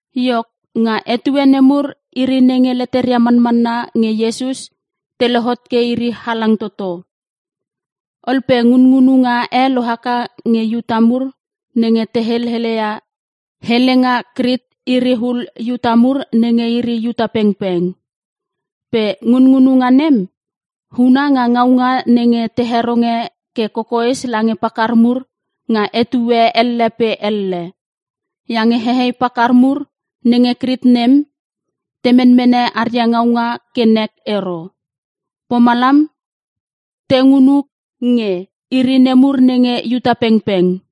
Iok nga etue nemur iri nenge leteria manmanna nge Iesus te lohot ke iri halang toto. Ol pe ngunngunuga e lohaka nge Iuta mur nenge te helelia helenga Krik iri ul Iuta mur nenge iri Iuta pengpeng. Pe ngunngununga nem, huna nga ngaunga nenge te heronge ke kokoes lange pakar mur nga etue elle pe elle. Iange hei pakar mur nenge Krik nem, te menmene aria ngaunga ke nek ero. Pomalam te ngungu nge iri nemur nenge Iuta pengpeng.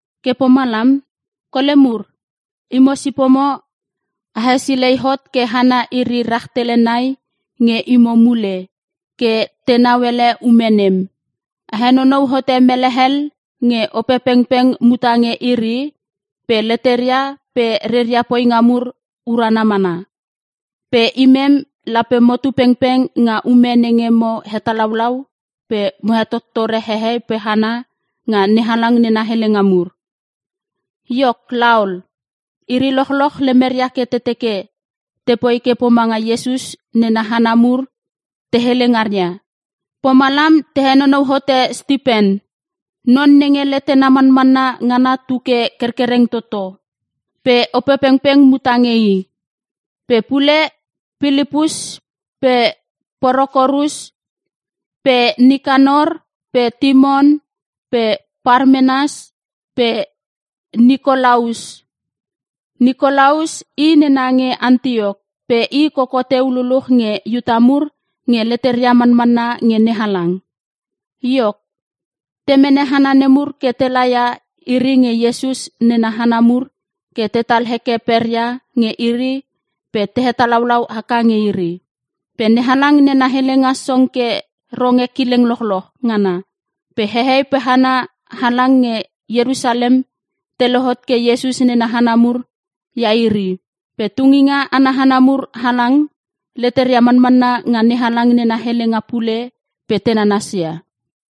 Ke pomalam, kole mur, imo sipomo a hesilei hot ke hana iri rahtele nai nge imo mule, ke tenau ele ume nem. A henonou hote mele hel nge Opepengpeng muta nge iri, pe leteria pe reria poinga mur urana mana. Pe imem, lape motu pengpeng nga ume nenge mo hetalaulau pe mo hetottore hehei pe hana nga NeHalang nena helenga mur.” Iok laol, iri lochloch lemeria ke te teke tepoi ke pomanga Iesus nena hana mur te hele ngaria. Pomalam te henonou hote Stipen, non nenge letena manmanna ngana tuke kerkereng toto, pe Opepengpeng muta nge i. Pe pule Pililpus pe Prokorus pe Nikanor pe Timon pe Parmenas pe Nikolaus. Nikolaus i nena nge Antiok pe i koko teu luluch nge Iuta mur nge leteria manmanna nge NeHalang. Iok, te mene hana nemur ke te laia iri nge Iesus nena hana mur ke tetal heke peria nge iri pe te hetalaulau haka nge iri. Pe NeHalang nena helenga song ke ronge kileng lochloch ngana. Pe hehei pe hana halang nge Ierusalem te lohot ke Iesus nena hana mur ia iri. Pe tunginga ana hana mur halang, leteria manmanna nga NeHalang nena helenga pule pe te nanasia.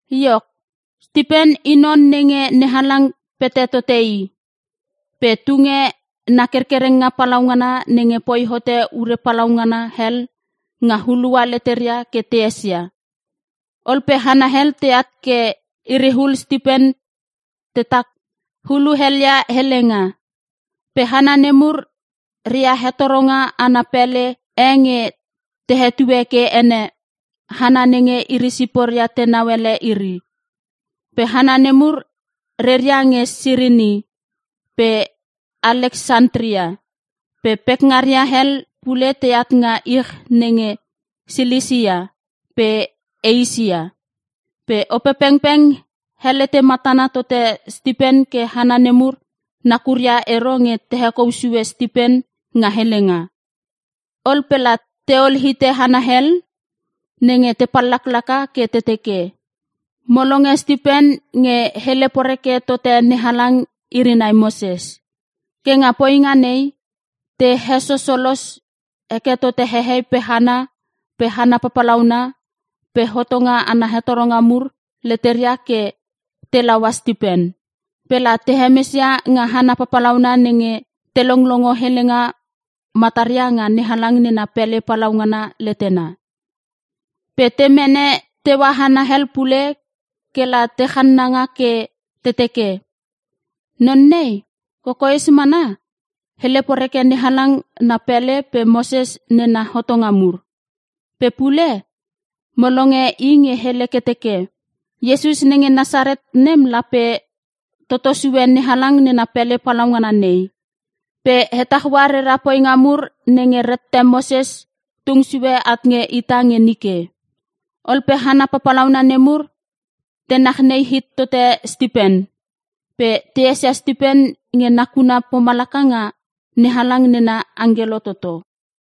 Iok, Stipen i non nenge NeHalang pete tote i, pe tunge na kerkerenga palaungana nenge poi hote ure papalaungana hel nga hulua leteria ke te esesia. Ol pe hana hel teat ke iriul Stipen tetak huluelia helenga. Pe hana nemur ria hetoronga ana pele e nge te hetue ke ene, hana nenge iri siporia tenau ele iri. Pe hana nemur reria nge Sirini pe Aleksantria, pe pekngaria hel pule teat nga ich nenge Silisia pe Eisia. Pe Opepengpeng helete matana tote Stipen ke hana nemur nakuria ero nge te hekou sue Stipen nga helenga. Ol pe la teol hite hana hel, nenge te pallaklaka ke te teke, “Mo longe Stipen nge hele poreke tote NeHalang iri nai Moses.” Ke nga poinga nei te hesosolos heke tote hehei pe hana pe hana papalauna pe hotonga ana hetoronga mur leteria ke telaua Stipen. Pe la te hemesia nga hana papalauna nenge te longlongo helenga mataria nga NeHalang nena pele palaungana letena. Pe te mene teua hana hel pule kela te channanga ke te teke, “Non nei, kokoes mana, hele poreke NeHalang na pele pe Moses nena hotonga mur. Pe pule, mo longe i nge hele ke teke, Iesus nenge Nasaret nem lape toto sue NeHalang nena pele palaungana nei, pe hetaua rera poinga mur nenge rette Moses tung sue at nge ita nge nike.” Ol pe hana papalauna nemur te nachnei hit tote Stipen, pe te esia Stipen nge nakuna pomalaka nga NeHalang nena angkelo toto.